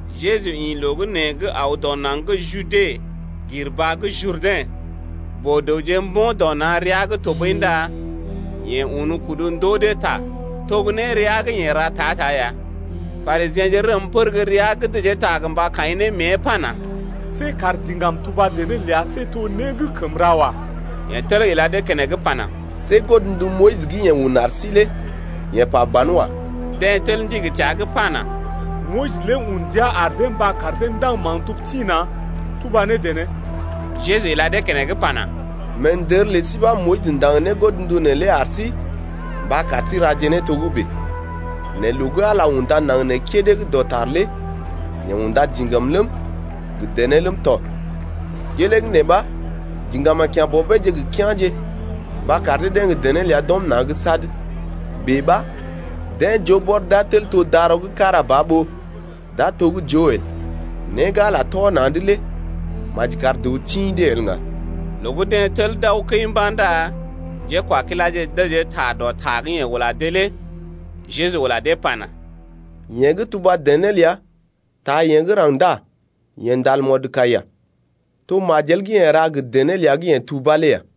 Jeju ḭ loo gə́ nee’g aw dɔ naŋg gə́ Jude gir baa gə́ Jurdɛ̰. Boo-dəwje mbo̰ dɔ na̰ rəa’g tɔɓəi ndá yeḛ un kudu ndoo dee ta, to gə́ nérea gə́ yeḛ ra ta-ta ya. Parisiḛje rəm pər gə́ rəa’g dəjee ta gə mba kaḭ ne mée pana: See kar diŋgam tuba dené ləa see to né gə́ kəm ra wa. Yeḛ tel ila dee keneŋ pana: See godndu Moyis gə́ yeḛ un ar sí lé yeḛ pa banwa. Deḛ tel ndigi təa’g pana: Moyis lé un ndia ar dee mba kar dee ndaŋg maktub tḭ-na̰ tuba ne dené. Jeju ila dee keneŋ pana: Meendər lə sí ɓa Moyis ndaŋg ne godndu neelé ar sí mba kar sí raje ne togə́bè. Nɛ loo gə́ Ala unda naŋg nee kédé gə́ dɔtar lé yeḛ unda diŋgam ləm, gə dené ləm tɔ. Gelee gə́ nee ɓa diŋgam a kya̰ bɔbeeje gə kea̰je mba kar dee-deḛ gə dené ləa d’ɔm na̰’d sad. Bèe ɓa deḛ joo bɔr d’a tel to dara gə́ kára ba ɓó d’a to gə́ joo el. Né gə́ Ala tɔ na̰’d lé maji kar dəw tḭ dee el ŋga. Loo gə́ deḛ tel d’aw kəi mba̰ ndá njékwakiláje dəjee ta dɔ ta gə́ yeḛ ula dee’g lé. Jeju ula dee pana: Yeḛ gə́ tuba dené ləa taa yeḛ gə́ raŋg ndá yeḛ ndal mɔdkaiya, to majel gə́ yeḛ ra gə dené ləa gə́ yeḛ tubá lé ya,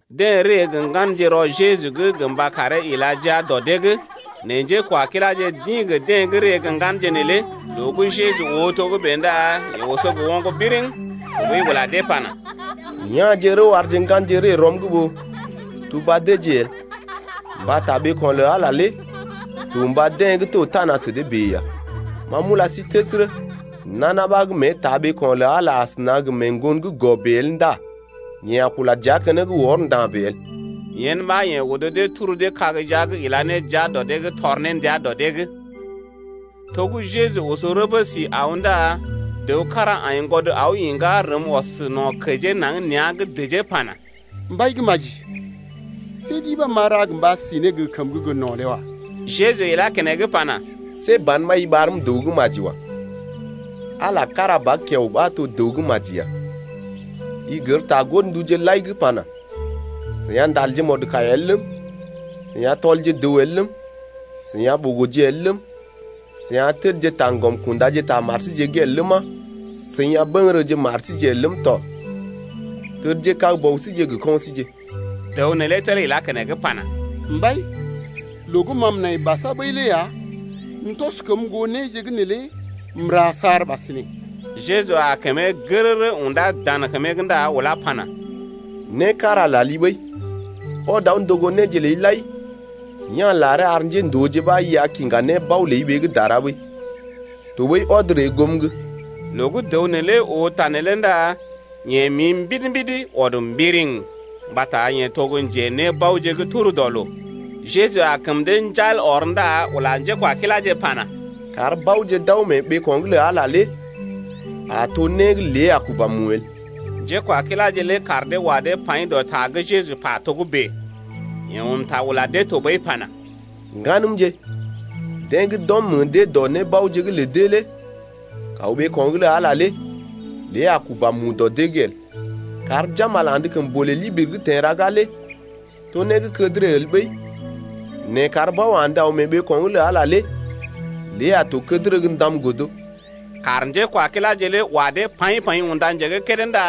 Deḛ ree gə ŋganje rɔ Jeju’g gə mba karee ila jia dɔ dee’g. Nɛ njékwakiláje d’ḭ gə deḛ gə́ ree gə ŋganje neelé. Loo gə́ Jeju oo togə́bè ndá yeḛ oso gə oŋg biriŋ, tɔɓəi ula dee pana: Ya̰je rəw arje ŋganje ree rɔm’g ɓó tuba deeje el, mbata ɓeeko̰ lə Ala lé to mba deḛ gə́ to tana sə dee bèe ya. Ma m’ula sí təsərə, nana ɓa gə́ mée taa ɓeeko̰ lə Ala asəna gə mee ŋgon gə́ gɔ bèe el ndá yeḛ a kula dəa keneŋ wɔr nda̰ bèe el. Yen ɓa yeḛ odo dee turu dee kag jia’g ila ne jia dɔ dee’g tɔr ne ndia dɔ dee’g. To gə́ Jeju oso rəbə si aw ndá dəw kára aiŋgwɔd aw iŋgá rəm ɔs no̰ kəjee naŋg nea̰’g dəjee pana: Mbai gə́ maji, see ɗi ɓa m’a ra mba si ne gə kəmə gə́ gə no̰ lé wa. Jeju ilá keneŋ pana: See ban ɓa i ɓarm dəw gə́ maji wa. Ala kára ba kiao ɓa to dəw gə́ maji ya. I gər ta godnduje lai gə́ pana: I a ndal mɔdkaiya el ləm, i a tɔl dəw el ləm, i a ɓogo el ləm, i a təd taŋgɔm kunda ta mari’g el ləma, i a buguru mari el ləm tɔ, tədjekag bɔbije gə kɔinje. Dəw neelé tel ilá keneŋ pana: Mbai, loo gə́ ma m’nai basa ɓəi lé ya, m’tɔs kəm goo néje gə́ neelé m’ra saar ɓasinè. Jeju aa kəmee gərərə undá dan kəmee’g ndá ulá pana: Né kára lali ɓəi. Ɔd aw ndogo néje ləi lai ya̰ laree ar njéndooje ɓa i a kiŋga nébao ləi ɓee gə́ dara ɓəi. Tɔɓəi ɔd ree goom’g. Loo gə́ dəw neelé oo ta neelé ndá yeḛ mi mbidi-mbidi, ɔd mbiriŋ, mbata yeḛ to gə́ njenébaoje gə́ tur dɔ loo. Jeju aa kəm dee njal ɔr ndá ula njékwakiláje pana: Kar baoje d’aw mee ɓeeko̰’g lə Ala lé a to né gə́ lé a kuba mu el! Njékwakiláje lé kaar dee wa dee paḭ dɔ ta gə́ Jeju pa togə́bè. Yeḛ un ta ula dee tɔɓəi pana: Ŋganəmje, deḛ gə́ d’ɔm meḛ dee dɔ nébaoje’g lə dee lé kaw ɓeeko̰’g lə Ala lé lée a kuba mu dɔ dee’g el! Kar jambal andə kəmbolè libiri’g teḛ raga lé to né gə́ kədərə el ɓəi, nɛ kar bao andə aw mee ɓeeko̰’g lə Ala lé lée a to kədərə gə́ ndam godo. Kaar njékwakiláje lé wa dee paḭ-paḭ unda njé gə́ kédé ndá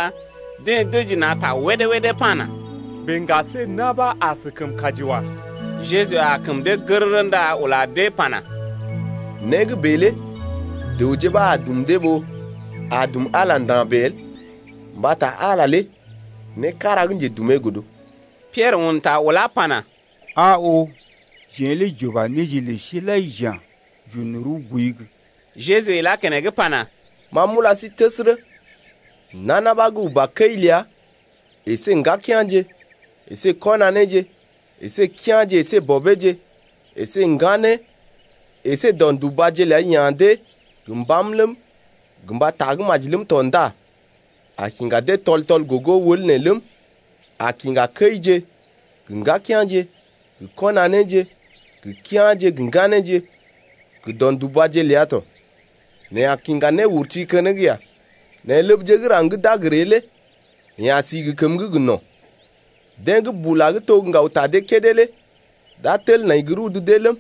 deḛ dəji na̰ ta wédé-wédé pana: Bèe ŋga see na̰ ɓa askəm kaji wa. Jeju aa kəm dee gərərə ndá ula dee pana: Né gə́ bèe lé dəwje ɓa a dum dee ɓó a dum Ala nda̰ bèe el, mbata Ala lé né kára gə́ njedumee godo. Piɛrə un ta ulá pana: Aa oo, jeḛ lé j’uba néje lə sí lai j’ya̰, j’un rəw gooi’g. Jeju ilá keneŋ pana: Ma m’ula sí təsərə, nana ɓa gə́ uba kəi ləa əsé ŋgakea̰je əsé kɔnaneeje əsé kea̰je əsé gə bɔbeeje əsé ŋganeeje əsé do̰dubaje ləa ya̰ dee gə mbam ləm, gə mba tagə́maji ləm tɔ ndá a kiŋga dee tɔl-tɔl gogo wəl nee ləm, a kiŋga kəije gə ŋgakea̰je gə kɔnaneeje gə kea̰je gə ŋganeeje gə do̰dubaje ləa tɔ, nɛ a kiŋga néurti keneŋ ya. Nɛ ləbje gə́ raŋg gə́ d’a gə ree lé yeḛ a si gə kəməgə́ gə no̰. Deḛ gə́ bula gə́ to gə́ ŋgaw ta dee kédé lé d’a tel nai gə́ rudu deeje ləm,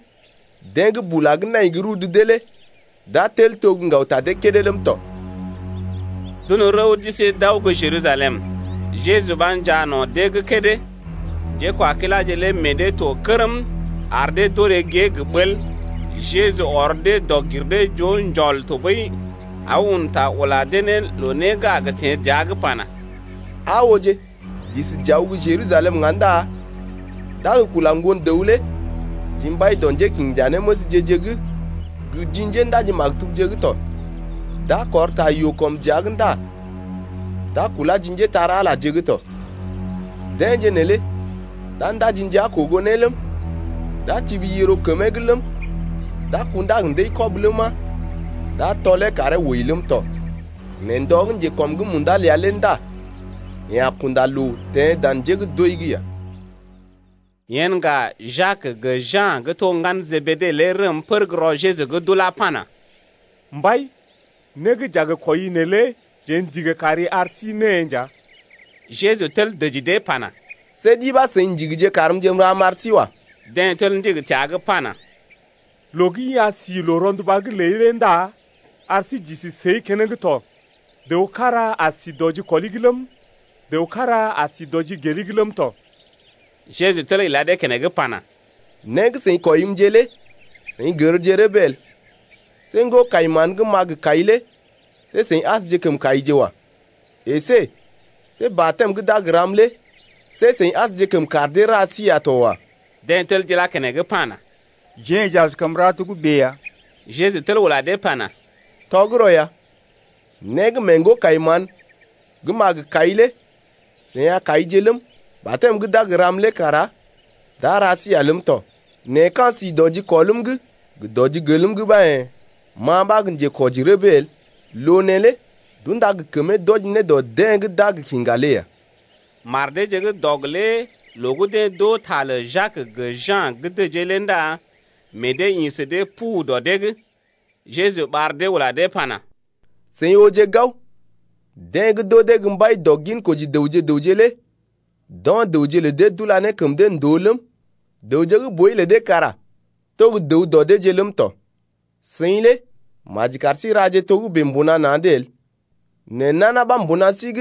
deḛ gə́ bula gə́ nai gə́ rudu deeje lé d’a tel to gə́ ŋgaw ta deeje kédé ləm tɔ. D’un rəw d’isi d’aw gə́ Jerusalem, Jeju ɓa njaa no̰ dee gə́ kédé. Njékwakiláje lé meḛ dee to kərm ar dee d’orè gée gə ɓəl. Jeju ɔr dee dɔg-gir-dee-joo njɔl tɔɓəi aw un ta ula dee ne loo né gə́ a teḛ dəa’g lé pana: Aa ooje, j’isi j’aw gə́ Jerusalem ŋga ndá d’a gə kula Ŋgon-dəw lé ji mbai dɔ njékinjanéməsje-je’g gə ji njéndaji-maktubje’g tɔ. D’a kɔr ta yoo kɔm dəa’g ndá d’a kulá ji njépole-magəje’g tɔ. Deḛje neelé d’a ndaji ndia kogo ne ləm, d’a tibi yiro kəmee’g ləm, d’a kundá gə ndəi-kɔb ləma, d’a tɔlee karee wəi ləm tɔ. Nɛ ndɔ gə́ njekɔm’g munda ləa lé ndá yeḛ a kunda loo teḛ dan njé gə́ d’wəi’g ya. Yen ŋga, Jak gə Ja̰ gə́ to ŋgalə Jebede lé rəm pər gə́ rɔ Jeju’g d’ulá pana: Mbai, né gə́ j’a gə kwɔii neelé jeḛ ndigi kari ar sí née ya. Jeju tel dəji dee pana: See ɗi ɓa seḭ ndigije karmje m’ra m’ar sí wa. Deḛ tel ndigi təa’g pana: Loo gə́ i a si loo-ronduba’g ləi lé ndá ar sí j’isi səi keneŋ tɔ, dəw kára a si dɔ jikɔli’g ləm, dəw kára a sí dɔ jigeli’g ləm tɔ. Jeju tel ila dee keneŋ pana: Né gə́ seḭ kwɔimje lé seḭ gərje rəbee el. See ŋgo-kai-mán gə́ m’a gə kai lé see seḭ asjekəm kaije wa. Esé see batɛm gə́ d’a gə ram lé see seḭ asjekəm kar dee ra sí ya to wa. Deḛ atel d’ilá keneŋ pana: Jeḛ j’askəm ra togə́bè ya. Jeju tel ula dee pana: Tɔgərɔ ya, né gə́ mee ŋgo-kai-mán gə́ m’a gə kai lé seḭ a kaije ləm, batɛm gə́ d’a gə ram lé kara d’a ra sí ya ləm tɔ. Nɛ ka̰ si dɔ jikɔlm’g gə dɔ jigelm’g ɓa yḛ̀, ma ɓa gə́ njekwɔji rəbee el. Loo neelé d’unda gə kəmee d’wɔji ne dɔ deḛ gə́ d’a gə kiŋga lé ya. Mar deeje gə́ dɔg lé loo gə́ deḛ d’oo ta lə Jak gə Ja̰ gə́ dəjee lé ndá meḛ dee ḭ sə dee pu dɔ dee’g. Jeju ɓar dee ula dee pana: Seḭ ooje gao, deḛ gə́ d’oo dee gə́ mbai dɔ ginkoji dəwje gə raŋg lé d’o̰ dəwje lə dee d’ula ne kəm dee ndòo ləm, dəwje gə́ boi lé deḛ kara to gə́ dəw dɔ deeje ləm tɔ. Seḭ lé maji kar sí raje togə́bè mbuna na̰’d el. Nɛ nana ɓa mbuna sí’g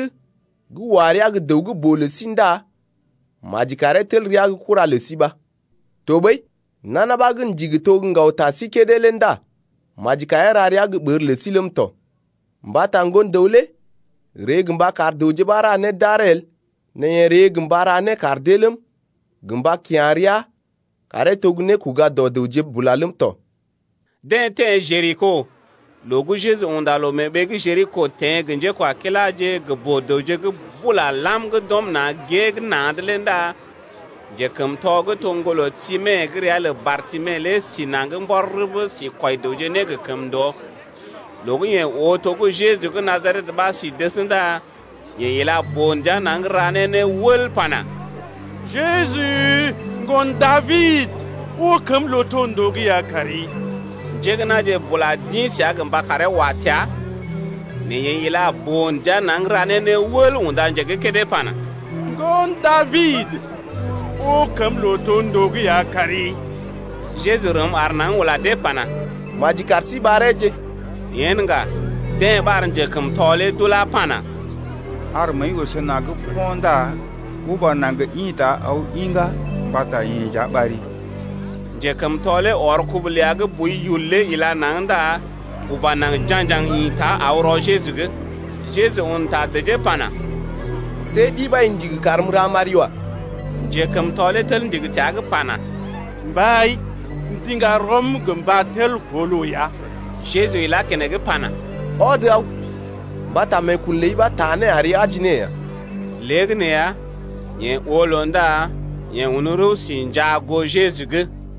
gə́ wa rəa gə dəw gə́ boo lə sí ndá maji karee tel rəa gə́ kura lə sí ɓa. Tɔɓəi nana ɓa gə́ ndigi to gə́ ŋgaw ta sí kédé lé ndá maji karee ra rəa gə́ ɓər lə sí ləm tɔ. Mbata Ŋgon-dəw lé ree gə mba kar dəwje ɓa ra né d’aree el nɛ yeḛ ree gə mba ra né kar dee ləm, gə mba kya̰ rəa karee to gə́ nékoga-dɔ-dəwje bula ləm tɔ. Deḛ teḛ Jeriko. Loo gə́ Jeju unda loo mee ɓee gə́ Jeriko teḛ gə njékwakiláje gə boo-dəwje gə́ bula lam gə́ d’ɔm na̰ gée’g na̰’d lé ndá njekəmtɔ gə́ to ŋgolə Time gə́ ria lə Bartime lé si naŋg mbɔr rəbə sí kwɔi dəwje né gə kəmndoo. Loo gə́ yeḛ oo to gə́ Jeju gə́ Najaret ɓa si dəs ndá yeḛ ila boo-ndia naŋg ra ne né wəl pana: Jeju, Ŋgon Dabid, oo kəm lootondoo’g ya kari. Njé gə́ na̰je bula d’ḭ səa gə mba karee wa təa. Nɛ yeḛ ila boo-ndia naŋg ra ne né wəl unda njé gə́ kédé pana: Ŋgon Dabid, oo kəm lootondoo’g ya kari. Jeju rəm aar naŋg ula dee pana, Maji kar sí ɓareeje. Yen ŋga, deḛ ɓar njekəmtɔ lé d’ulá pana: Ar məəi oso naŋg po̰ ndá uba naŋg ḭta aw iŋgá mbata yeḛ nja ɓari. Njekəmtɔ lé ɔr kubu ləa gə́ boi yul lé ila naŋg ndá uba naŋg ja̰gjaŋ ḭta aw rɔ Jeju’g. Jeju un ta dəjee pana: See ɗi ɓa i ndigi karm m’ra m’ari wa. Njekəmtɔ lé tel ndigi təa’g pana: Mbai, m’ndiŋga rɔm gə mba tel koo loo ya. Jeju ilá keneŋ pana: Ɔd aw mbata meekun ləi ɓa taa né ari aji ne ya. Léegəneeya, yeḛ oo loo ndá yeḛ un rəw si njaa goo Jeju’g.